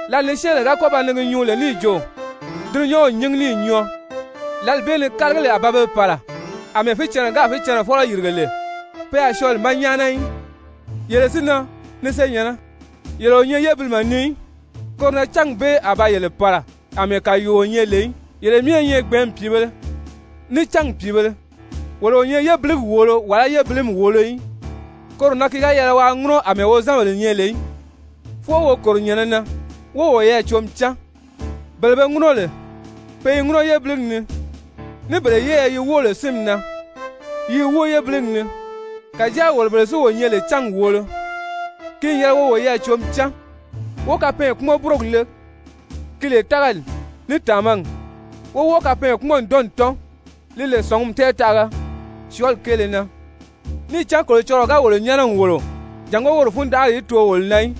Lǎli ni syɛ́ɛnbèle ga kɔ́ ba ni gi nyuu lè níì jo: «Dulunyanw n nyíngi níì nyɔɔ!» Lǎli bee ni kálagili a ba be pàla àmɛɛ fícɛnnɛ gáà fícɛnnɛfɔlɔ yìrige lè, pe a syɔɔ li ma nyáana í. Yele si na, ni senyɛ̀nnɛ, yele o nyɛ yébilimɛ ni í, koro na cángi bee a ba yele pàla àmɛɛ kàyuuo nyɛ lè í. Yele myɛ i nyɛ gbɛ̀ɛ́nmi pìibēle, ní cángi pìibēle. Wolo o nyɛ yébiligi wòolo wàlá yébilimi wòolo í. Koro na ki ga yɛlɛ waa ŋúnɔ àmɛɛ wozanbèle nyɛ lè í, fwɔɔ wo kòro nyɛ̀nɛ na wó woyɛɛ cǒmi cán. Bele be ŋúnɔ lè, pe i ŋúnɔ yébiligi ni, ní bele yɛ́ɛyɛ yi wóo lè sínmi na, yi i wóo yébiligi ni. Kàjáa wolo bele si wo nyɛ lè cángi wòolo, ki n yɛlɛ wo woyɛɛ cǒmi cán, wó kapɛɛnkpumɔn-búrogi le, ki lè tágali ní tàmagi, wó wɔ́ɔ kapɛɛnkpumɔn-ǹdɔnni tɔ́n, li lè sɔ̀ngumi tɛɛtaʔaga syɔɔli kéele na. Níì cán Kolocɔlɔɔ ga wolo nyɛ́nɛ n wòlo jàngó woro fundanʔari í too wo na í,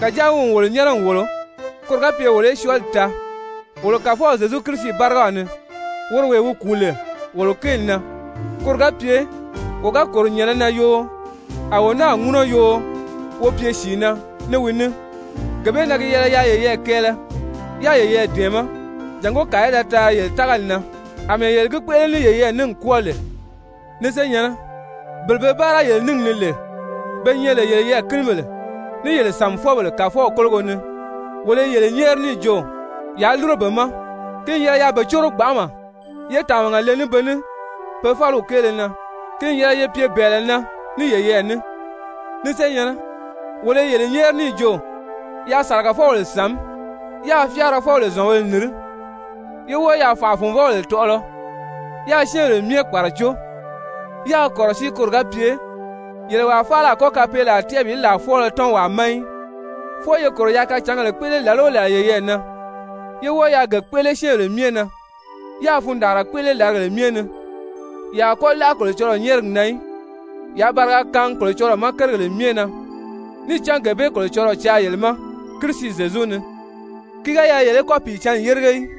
kàjáa wi n wolo nyɛ́nɛ n wòlo koro ga pye wolo í syɔɔli taa wolo Kàfɔw Zyezu Kirisi bárigaw ni, woro wee wi kùu lè wolo kéeli na, koro ga pye wo ga kòro nyɛ̀nɛ na yoo, a wo náa i ŋúnɔ yoo, wo pye sìi na ní wi ní. Gee bee na gi yɛlɛ yaa yeyɛɛ kɛɛlɛ, yáā yeyɛɛ dɛ̀ɛmɛ́ jàngó kàa í da taari yele tágali na, àmɛɛ yele gi kpéʔele ní yeyɛɛ ní n kwɔ́ɔ lè. Ni senyɛ̀nnɛ, bele be báara yele níngi ni lè be nyɛ lè yele yɛɛ̀kinibèle ní yele sàmifɔbèle Kàfɔw kólogo ni, wolo i yele nyɛ́ɛri níì jo, yaa lúro be ma. Ki n yɛlɛ yaa be córo gbanʔama, yé tàmaga le ní be ní pe fáliw kéele na. Ki n yɛlɛ ye pye bɛ̀ɛlɛ na ní yeyɛɛ ní. Ni senyɛ̀nnɛ, wolo i yele nyɛ́ɛri níì jo, yaa sàlagafɔbèle sàmí, yáā fyáarafɔbèle zɔ̀nbēle nìrí, yé wɔ́ɔ yaa fànʔa-fùnvɔbèle tɔʔɔlɔ, yáā syɛ́ɛnbèle myɛ kpàracó. Yaa kɔ̀rɔsíi koro ga pye yele wàa faala a kɔ́ kapeelaa tɛ́ʔɛ bi làa fwɔ́ɔlɔ tɔ́n wàa ma í. Fwɔɔ ye kòro yaa kacàngēle kpéʔele làla o làla yeyɛɛ na yé wɔ́ɔ yaa ge kpéʔele syɛ́ɛnbèle myɛ na. Yaa fundaanra kpéʔele làrigèle myɛ ni. Ye a kɔ́ láʔa Kolocɔlɔɔ nyɛ́ɛrigi na í. Yaa bariga kaangi Kolocɔlɔɔ ma kérigèle myɛ na. Níì cán gee bee Kolocɔlɔɔ caa yele ma Kirisi Zyezu ni. Ki ga yɛlɛ yele í kɔ́ Pìicǎnni yérige í.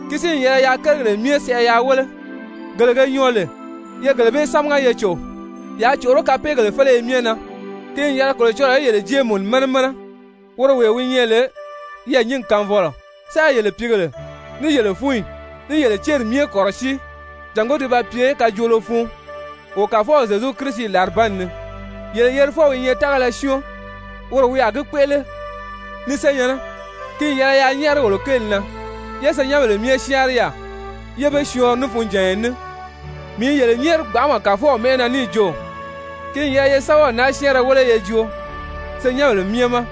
Ki si n yɛlɛ yaa kérigèle myɛ sɛʔɛ yaa wéle, gele ge nyɔɔ lè, ye gele bee sámaga ye cò. Yaa còʔoró kapeegèle féleye myɛ na. Ki n yɛlɛ Kolocɔlɔɔ í yele jée mùnu mɛnɛ mɛnɛ, woro wee wi nyɛ lè yɛɛ̀nyingi kaanfɔlɔ, sáā yele pìígèle, ní yele fúnyi, ní yele céri myɛ kɔ̀rɔsíi jàngó ti ba pye kajoolo fun wo Kàfɔw Zyezu Kirisi làribanni ni! Yele yerifɔw i nyɛ tágala syɔ́ɔn, woro wi a gi kpéʔele. Ni senyɛ̀nnɛ, ki n yɛlɛ yaa nyɛ́ɛri wolo kéeli na. Ye senyɛnbèle myɛ syáanri yaà, yé be syɔɔnri ní funjànya ní. Mii i yele nyɛ́ɛri gbanʔama Kàfɔw mɛ́ʔɛ na níì jo, ki n yɛlɛ ye sɛ́bɛw naa syɛ́ɛnrɛ wéle ye joo senyɛnbèle myɛ ma.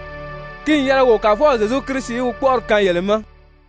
Ki n yɛlɛ wo Kàfɔw Zyezu Kirisi í wi kpɔ́ʔɔri kaan yele ma!